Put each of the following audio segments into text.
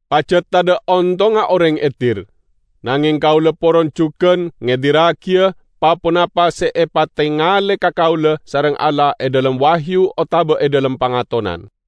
Pajat tadha' ontongnga oreng edir. Nangeng kaula poron jugan ngedirragiya pa-ponapa se epatengale ka kaula sareng Allah e dhalem wahyu otaba e dhalem pangatonan.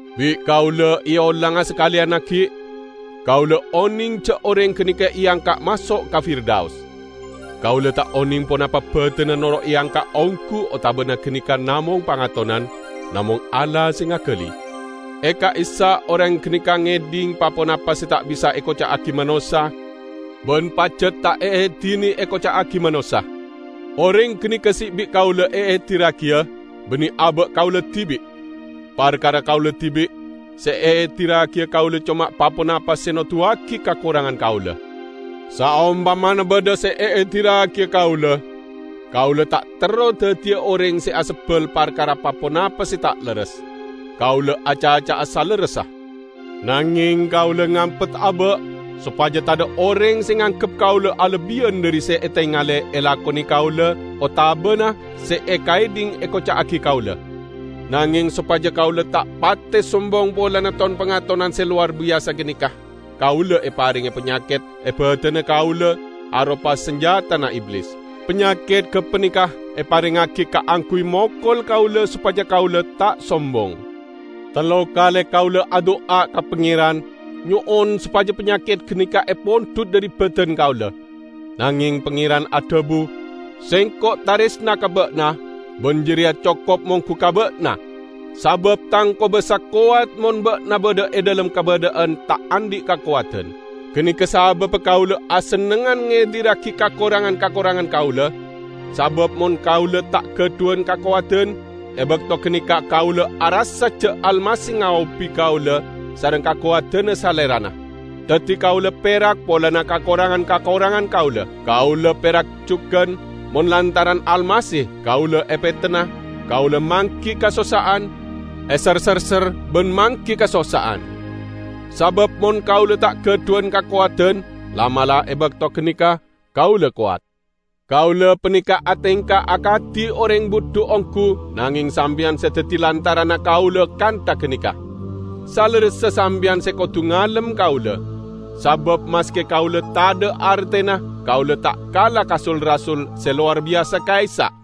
Bi' kaula eolanga sakaleyan aggi': Kaula oneng ja' oreng ganeka eangka' maso' ka Firdaus. (Kaula ta' oneng ponapa badanna noro' eangka' onggu otabana ganeka namong pangatonan -- namong Allah se ngagali.) E ka'issa' oreng ganeka ngedhing pa-ponapa se ta' bisa ekoca'agi manossa ban pajat ta' eedine ekoca'agi manossa. Oreng ganeka se bi' kaula eedirragiya, banne aba' kaula dibi'. Parkara kaula dibi', se eedirragiya kaula coma pa-ponapa se noduwagi kakorangan kaula. Saompamana badha se eedirragiya kaula, kaula ta' terro daddiya oreng se asebbal parkara pa-ponapa se ta' lerres; kaula acaca'a salerressa. Nangeng kaula ngampet aba', sopaja tadha' oreng se nganggep kaula alebbiyan dhari se etengale elakone kaula otabana se ekaedhing ekoca'agi kaula. Nangeng sopaja kaula ta' pate sombong polana ton-pangatonan se lowar biyasa ganeka, kaula eparenge panyaket e badanna kaula aropa sanjatana Iblis. Panyaket gapaneka eparengngagi kaangguy mokol kaula sopaja kaula ta' sombong. Tello kale kaula adu'a ka Pangeran, nyo'on sopaja panyaket ganeka epondhut dhari badan kaula. Nangeng Pangeran adhabu, "Sengko' taresna ka ba'na, ban jareya cokop monggu ka ba'na; sabab Tang kobasa kowat mon ba'na badha e dhalem kabadha'an ta' andhi' kakowadan." Ganeka sababba kaula asennengngan ngedirragi kakorangan-kakorangan kaula, sabab mon kaula ta' gadhuwan kakowadan, e bakto ganeka kaula arassa ja' Almasih ngaobi kaula sareng kakowadanna Salerana. Daddi kaula perak polana kakorangan-kakorangan kaula. Kaula perak jugan mon lantaran Almasih kaula epetenna, kaula manggi kasossa'an, eser-serser ban manggi kasossa'an. Sabab mon kaula ta' gadhuwan kakowadan, la'-mala' e bakto ganeka kaula kowat. Kaula paneka atengka akadi oreng budhu onggu -- nangeng sampeyan se daddi lantaranna kaula kantha ganeka. Salerressa sampeyan se kodu ngalem kaula. Sabab maske kaula tadha' artena, kaula ta' kala ka "sul-rasul" se lowar biyasa ka'issa'!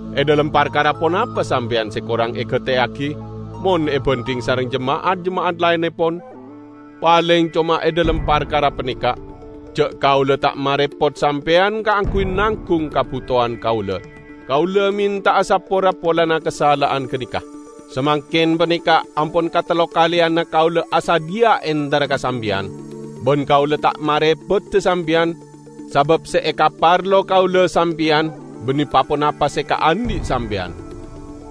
E dhalem parkara ponapa sampeyan se korang egateyagi, mon ebandhing sareng jema'at-jema'at laennepon? Paleng coma e dhalem parkara paneka: ja' kaula ta' marepot sampeyan kaangguy nanggung kabutowan kaula. Kaula menta'a sapora polana kasala'an ganeka! Samangken paneka ampon katellokaleyanna kaula asadhiya entara ka sampeyan. Ban kaula ta' marepoda sampeyan, sabab se ekaparlo kaula sampeyan, banne pa-ponapa se ekaandhi' sampeyan.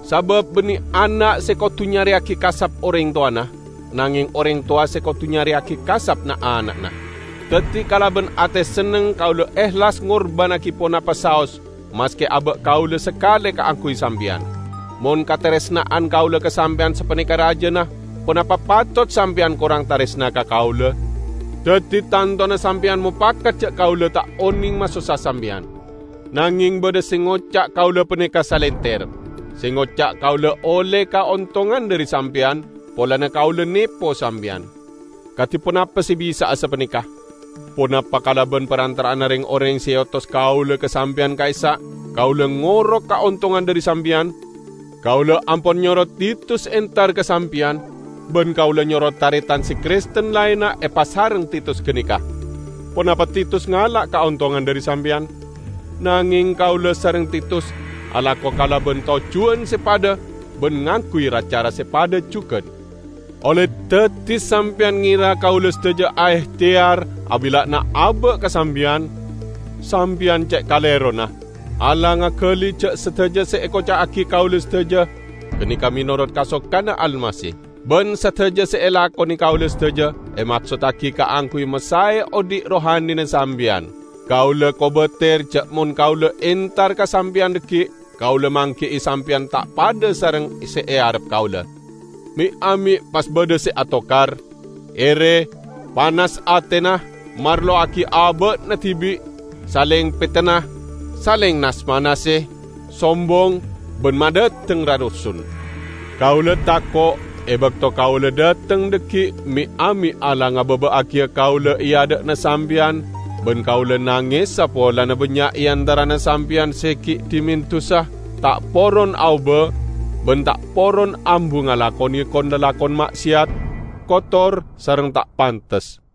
Sabab banne ana' se kodu nyareyagi kasap oreng towana, nangeng oreng towa se kodu nyareyagi kasap na'-ana'na. Daddi kalaban ate senneng kaula ehlas ngorbannagi ponapa saos maske aba' kaula sakale kaangguy sampeyan. Mon kataresna'an kaula ka sampeyan sapaneka rajana, ponapa patot sampeyan korang taresna ka kaula? Daddi tantona sampeyan mopakat ja' kaula ta' oneng masossa sampeyan. Nangeng badha se ngoca' kaula paneka salenter; se ngoca' kaula olle kaontongan dhari sampeyan polana kaula nepo sampeyan. Kadi ponapa se bisa'a sapaneka! Ponapa kalaban parantara'anna reng-oreng se eotos kaula ka sampeyan ka'issa' kaula ngoro' kaontongan dhari sampeyan? Kaula ampon nyoro Titus entar ka sampeyan, ban kaula nyoro taretan se Kristen laenna epasareng Titus ganeka. Ponapa Titus ngala' kaontongan dhari sampeyan? Nangeng kaula sareng Titus alako kalaban tojjuwan se padha ban ngangguy ra-cara se padha jugan. Olle daddi sampeyan ngera kaula sadaja aehteyar abilla'ana aba' ka sampeyan? Sampeyan ce' kalerona! Allah ngagali ja' sadaja se ekoca'agi kaula sadaja ganeka menorot kasokanna Almasih. Ban sadaja se elakone kaula sadaja emaksottagi kaangguy masae odhi' rohanina sampeyan. Kaula kobater ja' mon kaula entar ka sampeyan dhaggi', kaula manggi'i sampeyan ta' padha sareng se earep kaula. Me'-ame' pas badha se atokar, ere, panas atena, marlowagi aba'na dibi', saleng petenna, saleng nas-manase, sombong ban madhateng rarusun. Kaula tako' e bakto kaula dhateng dhaggi' me'-ame' Allah ngababa'agiya kaula e adha'na sampeyan ban kaula nangesa polana bannya' e antarana sampeyan se gi' dhimen dusa, ta' poron aoba ban ta' poron ambu ngalakone kon-lalakon ma'seyat, kotor sareng ta' pantes.